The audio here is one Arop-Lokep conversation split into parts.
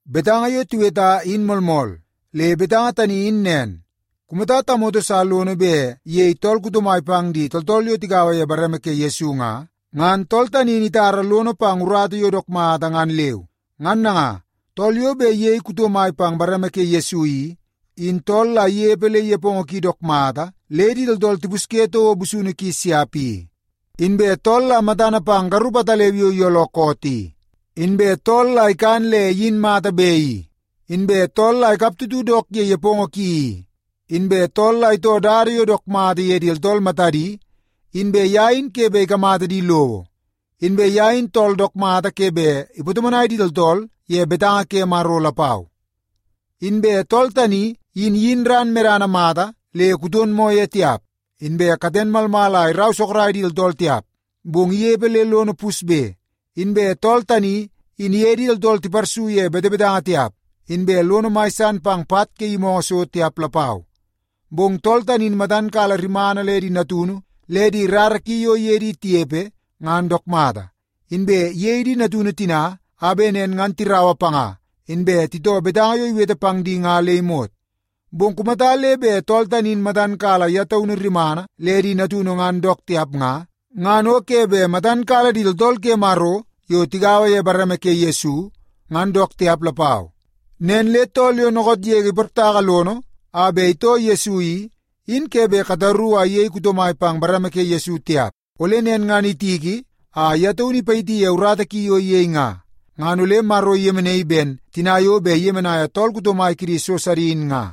Betanga yo tiweta in moolmool. Le betanga tani in nen, kumata tamoto sa lono bet iyei tool kuto mai pang di tooltool yo tigaua ye bareme ke Yesu nga, ngan tool tani in itara lono pang urata yo dook mata ngan leu. Ngan nanga, tool yo bet iyei kuto mai pang bareme ke Yesu i, in tool la inepe le nepongo ki dook mata le di tooltool tipusye toko busunu ki siap i, inbe tool la matana pang garup ataleu yo iyooloo koot i, inbe tool la ikan le iyin mata be i, inbe tool la ikaptutu dook ye nepongo ki i, inbe tool la itoo dada yo dook mata ye di tooltool matadi, inbe ye in ke bet ikamata di lowo, inbe ye in tool dook mata ke bet ipatomonai di tooltool ye betanga ke Maro lapau. Inbe tool tani in iyin ran medana mata le kuton moo ye tiap, inbe katen malmal a irau sorok di tooltool tiap, bong inepe le lono pusbe. Inbe tool tani in iye di tooltool tiparsu ye betebetanga tiap, inbe lono mai san pang pat ke yimoongoo so tiap lapau. Bong tool tani in matan kala rimana le di natunu le di rara ki yo iye di tinepe ngan dook mata, inbe iyei di natunu tina a bet nen ngan tiraua panga inbe titoo betanga yo iwete pang di ye nga le imot. Bong kumata le bet tool tani in matan kala ye taunu rimana le di natunu ngan dook tiap nga, ngan o ke bet matan kala di tooltool ke Maro yo tigaua ye bareme ke Yesu, ngan dook tiap lapau. Nen le tool yo dookoot yege iportaka lono a bet itoo Yesu i, in ke bet kataru a iyei kuto mai pang bareme ke Yesu tiap. Ole nen ngan itiki a ye taunu ipayiti ye urata ki yo iyei nga, ngan ole Maro iyemenaii ben tina yo bet iyemenaia tool kuto mai kidi so sidi in nga.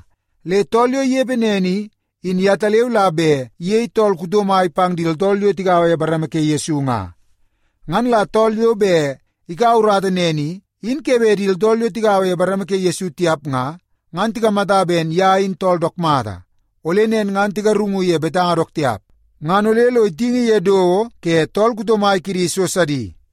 Le tool yo inepe nen i, in yetaleu la bet iyei tool kuto mai pang di tooltool yo tigaua ye bareme ke Yesu nga. Ngan la tool yo bet ikaua urata nen i, in ke bet di tooltool yo tigaua ye bareme ke Yesu tiap nga, ngan tikamata ben ye in tool dook mata. Ole nen ngan tigarungu ye betanga dook tiap, ngan ole lo itingi ye dowo ke tool kuto mai kidi so sidi.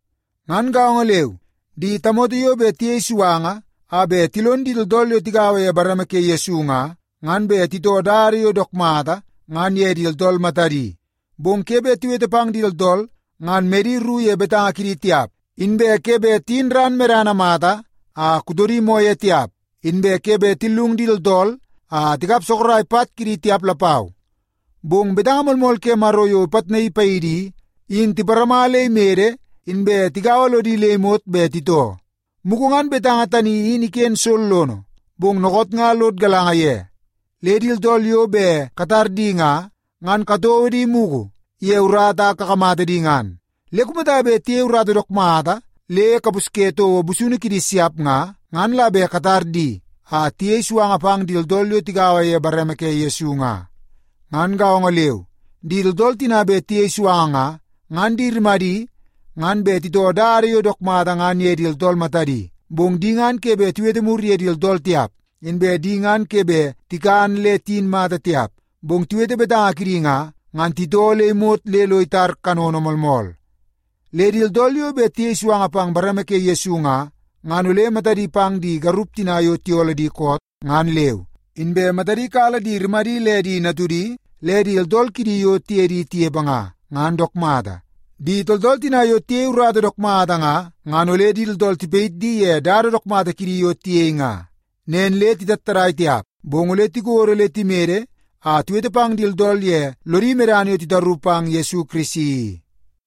Ngan gaongo leu, di tamoto yo bet tiyei suanga a bet tilon di tooltool yo tigaua ye bareme ke Yesu nga, ngan bet titoo dada yo dook mata ngan ye di tooltool matadi. Bong ke bet tiwete pang di tooltool ngan medi ru ye betanga kidi tiap, inbe ke bet tiyin ran medana mata a kutodi moo ye tiap, inbe ke bet tillung di tooltool a tikap sorok pat kidi tiap lapau. Bong betanga moolmool ke Maro yo ipitnaii paidi i, in tiparama le imede inbe tigaua lodi le imot bet titoo. Mugu ngan betanga tani in iken sollono, bong dookoot nga lod galanga ye. Le di tooltool yo bet katar di nga, ngan katouo di mugu ye urata a kakamata di ngan. Le kumata bet tiyei urata dook mata le kapusye toko busunu kidi siap nga, ngan la bet katar di a tiyei suanga pang di tooltool yo tigaua ye bareme ke Yesu nga. Ngan gaongo leu, di tooltool tina bet tiyei suanga nga, ngan di rimadi ngan bet titoo dada yo dook mata ngan ye di tooltool matadi. Bong di ngan ke bet tiwete mur ye di tooltool tiap, inbe di ngan ke bet tikan le tiyin mata tiap. Bong tiwete betanga kidi nga, ngan titoo le imot le lo itar kanono moolmool. Le di tooltool yo bet tiyei suanga pang bareme ke Yesu nga, ngan ole matadi pang di garup tina yo tiyooloo di koot, ngan leu, inbe matadi kala di rimadi le di natudi le di tooltool kidi yo tiye di tinepe nga, ngan dook mata. Di tooltool tina yo tiyei urata dook mata nga, ngan ole di tooltool tipayit di ye dada dook mata kidi yo tiyei nga. Nen le titattadai tiap, bong ole tikodo le timede a tiwete pang di tooltool ye lodi medana yo titaru pang Yesu Kirisi i.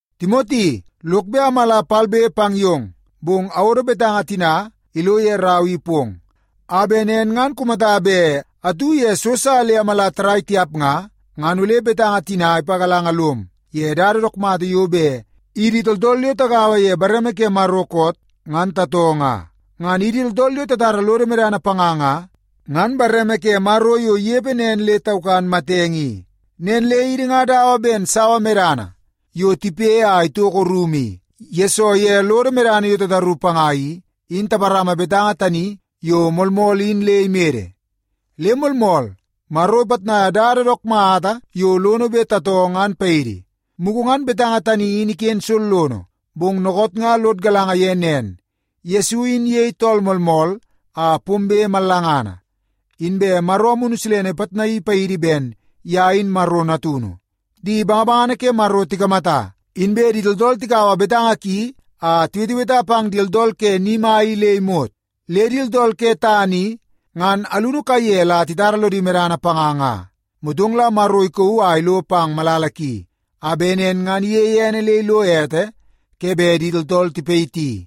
Timoti, lok bet amala palbe pang yong. Bong awodo betanga tina ilo ye rau i pong, a bet nen ngan kumata bet atu ye so sa le amala tarrai tiap nga, ngan ole betanga tina ipagalanga lom ye dada dook mata yo bet idi tooltool yo tagaua ye bareme ke Maro koot, ngan tatoo nga. Ngan idi tooltool yo tatara lodo medana panga nga, ngan bareme ke Maro yo inepe nen le taukan matenge i. Nen le idi nga dawa ben sawa medana yo tipe a itoko rumu i, yesoo ye lodo medana yo tataru panga i, in taparama betanga tani yo moolmool in le imede. Le moolmool, Maro ipitnai dada dook mata yo lono bet tatoo ngan paidi. Mugu ngan betanga tani in iken sollono, bong dookoot nga lod galanga ye nen: Yesu in iyei tool moolmool a pombe mallangana. Inbe Maro Amunu Silene ipitnaii paidi ben ye in Maro natunu. Di bangabangana ke Maro tikamata. Inbe di tooltool tikaua betanga ki a tiweteweta pang di tooltool ke ni mai i le imot. Le di tooltool ke tana i ngan alunu kaiye la titara lodi medana panga nga. Motong la Maro ikauu a ilo pang malala ki, a bet nen ngan iyeie ene le ilo ete ke bet di tooltool tipayiti.